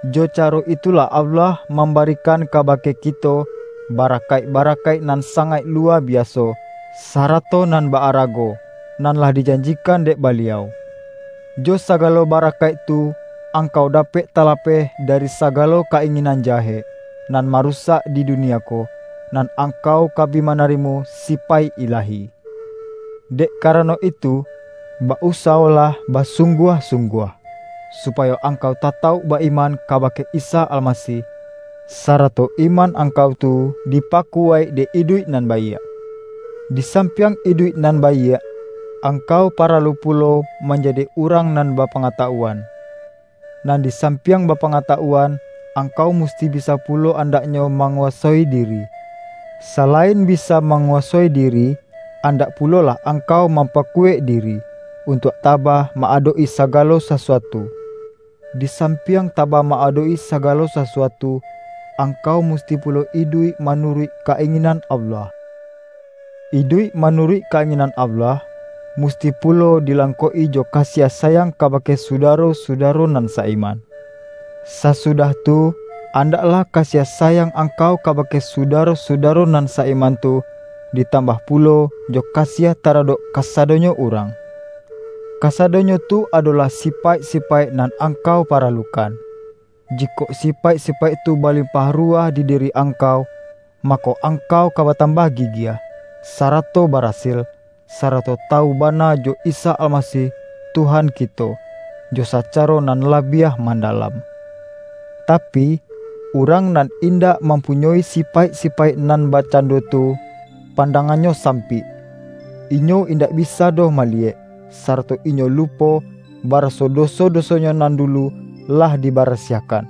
Jo caro itu-lah Allah mambarikan kabake kito, barakaik-barakaik nan sangaik luwa biaso, sarato nan ba-arago, nan lah dijanjikan dek Baliau. Jo sagalo ba-rakaik tu, angkau dapek talapeh dari sagalo ka-inginan jahek, nan marusak di dunia ko, nan angkau ka bi ma-narimo sipaik ilahi. Dek karano itu, ba-usawolah basungguah-sungguah, supayo angkau tatauk ba-iman kaba-ke Isa Almasih, sarato iman angkau tu dipakuwaik dek iduik nan baiak. Di sampiang iduik nan baiak, ang-kau paralu pulo manjadi urang nan bapangatawuan, nan di sampiang bapangatawuan, angkau musti bisa pulo andaknyo manguwasoi diri. Sa-lain bisa manguwasoi diri, andak pu-lolah angkau mampakuwaik diri, un-tuak tabah ma-adok-i sagalo sasuatu. Di sampiang tabah ma-adok-i sagalo sasuatu, angkau musti pulo iduik ma-nuruik ka-inginan Allah. Iduik ma-nuruik ka-inginan Allah, musti pulo dilangkok-i jo kasiah sayang kabake sudaro-sudaro nan sa-iman. Sasudah tu, andaklah kasiah sayang angkau kabake sudaro-sudaro nan sa-iman tu, ditambah pulo jo kasiah taradok kasa-donyo urang. Kasadonyo tu adolah sipaik-sipaik nan angkau paralukan. Jikok sipaik-sipaik tu balimpah ru-wah di diri angkau, mako, angkau ka batambah gigiah, sarato barasil, sa-rato tawu bana jo Isa Almasih Tuhan kito, jo sacaro nan labiah mandalam. Tapi, urang nan indak mampunyoi sipaik-sipaik nan bakcando tu, pan-dangannyo sampik; inyo indak bisa doh maliyek, sarato inyo lupo, bara-so doso-dosonyo nan dulu lah diba-rasiahkan.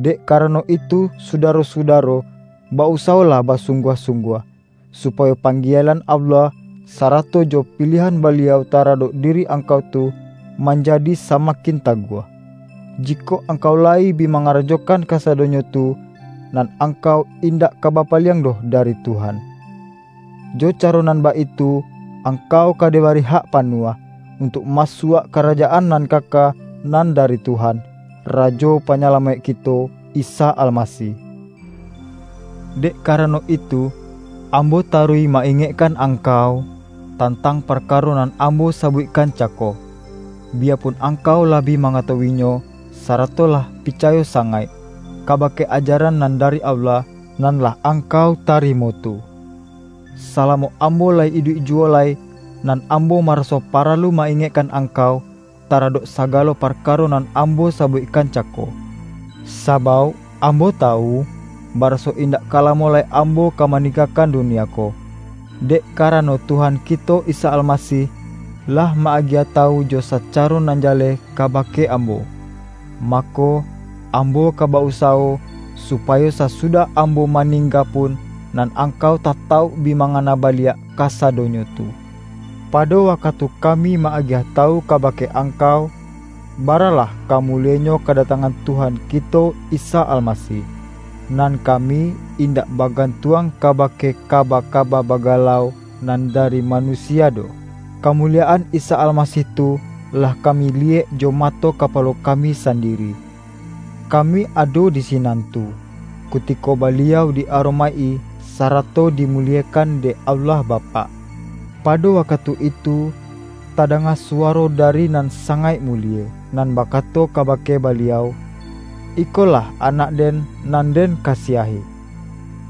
Dek karano itu, sudaro-sudaro, ba-usawolah basungguah-sungguah, supayo panggielan Allah, sarato jo piliahan Baliau taradok diri angkau tu, manjadi samakin taguah. Jikok angkau layi bi mangarajokan kasado-nyo tu, nan angkau indak ka bapa-liang doh dari Tuhan. Jo caro nan baitu, angkau ka dibari hak panuah, untuak masuak Karajaan nan kaka nan dari Tuhan, Rajo Panyalamaik kito Isa Almasih. Dek karano itu, ambo taruih ma-ingekkan angkau, tantang parkaro nan ambo sabuikkan cako, biyapun angkau lah bi mangatawu-inyo, sara-to lah picayo sangaik, kabake ajaran nan dari Allah, nan lah angkau tarimo tu. Salamo ambo layi iduik juwo lai, nan ambo maraso paralu ma-ingek-kan angkau, taradok sagalo parkaro nan ambo sabuikkan cako. Sabauk ambo tawu, baraso indak ka lamo lai ambo ka maninggakan dunia ko, dek karano Tuhan kito Isa Almasih, lah ma-agiah tawu jo sacaro nan ja-leh kabake ambo. Mako, ambo ka ba-usawo, supayo sasudah ambo ma-ningga pun, nan angkau tatauk bi ma-ngana baliak kasadonyo tu. Pado wakatu kami ma-agiah tawu kabake angkau, baralah ka mulienyo kadatangan Tuhan kito Isa Almasih, nan kami indak bagantuang kabake kaba-kaba bagalau nan dari manusia doh. Kamuliyaan Isa Almasih tu, lah kami liyek jo mato kapalo kami sandi-ri. Kami ado di sinan tu, kutiko Ba-liau di-aromaik-i, sarato dimuliekan dek Allah Bapak. Pado wakatu itu, ta-danga suwaro dari Nan Sangaik Mu-lie, nan bakato kabake Baliau,”Iko-lah Anak-Den nan Den kasiahi.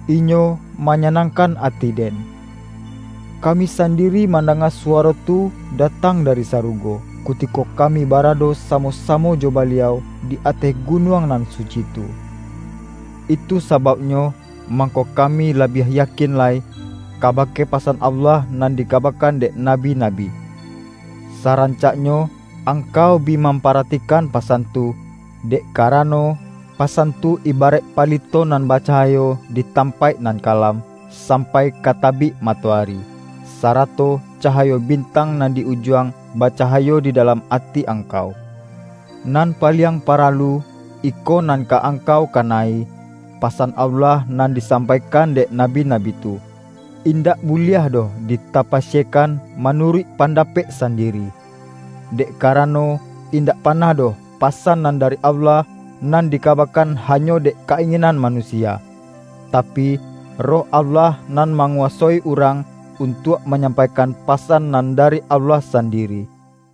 Inyo manyanangkan ati-Den!” Kami san-diri mandanga suwaro tu datang da-ri sarugo, kutiko kami barado samo-samo jo Baliau di ateh gunuang nan suci tu. Itu sabauknyo, mangko kami la-biah yakin lai, kabake pasan Allah nan dikabakan dek nabi-nabi. Saran-caknyo angkau bi mamparatikan pa-san tu, dek karano, pasan tu ibaraik palito nan bacahayo di tampaik nan kalam, sampai ka tabik matoari, sara-to cahayo bintang nan di Ujuang, ba-cahayo di dalam ati angkau. Nan paliang paralu, iko nan ka angkau kana-i: Pasan Allah nan disampaikan dek nabi-nabi tu, indak buliah doh ditapasiekan manuruik pandapek san-diri. Dek karano, indak panah doh pasan nan dari Allah, nan dikabakan hanyo dek ka-inginan manusia. Tapi, Roh Allah nan manguwasoi urang, untuak manyampaikan pasan nan da-ri Allah sandiri.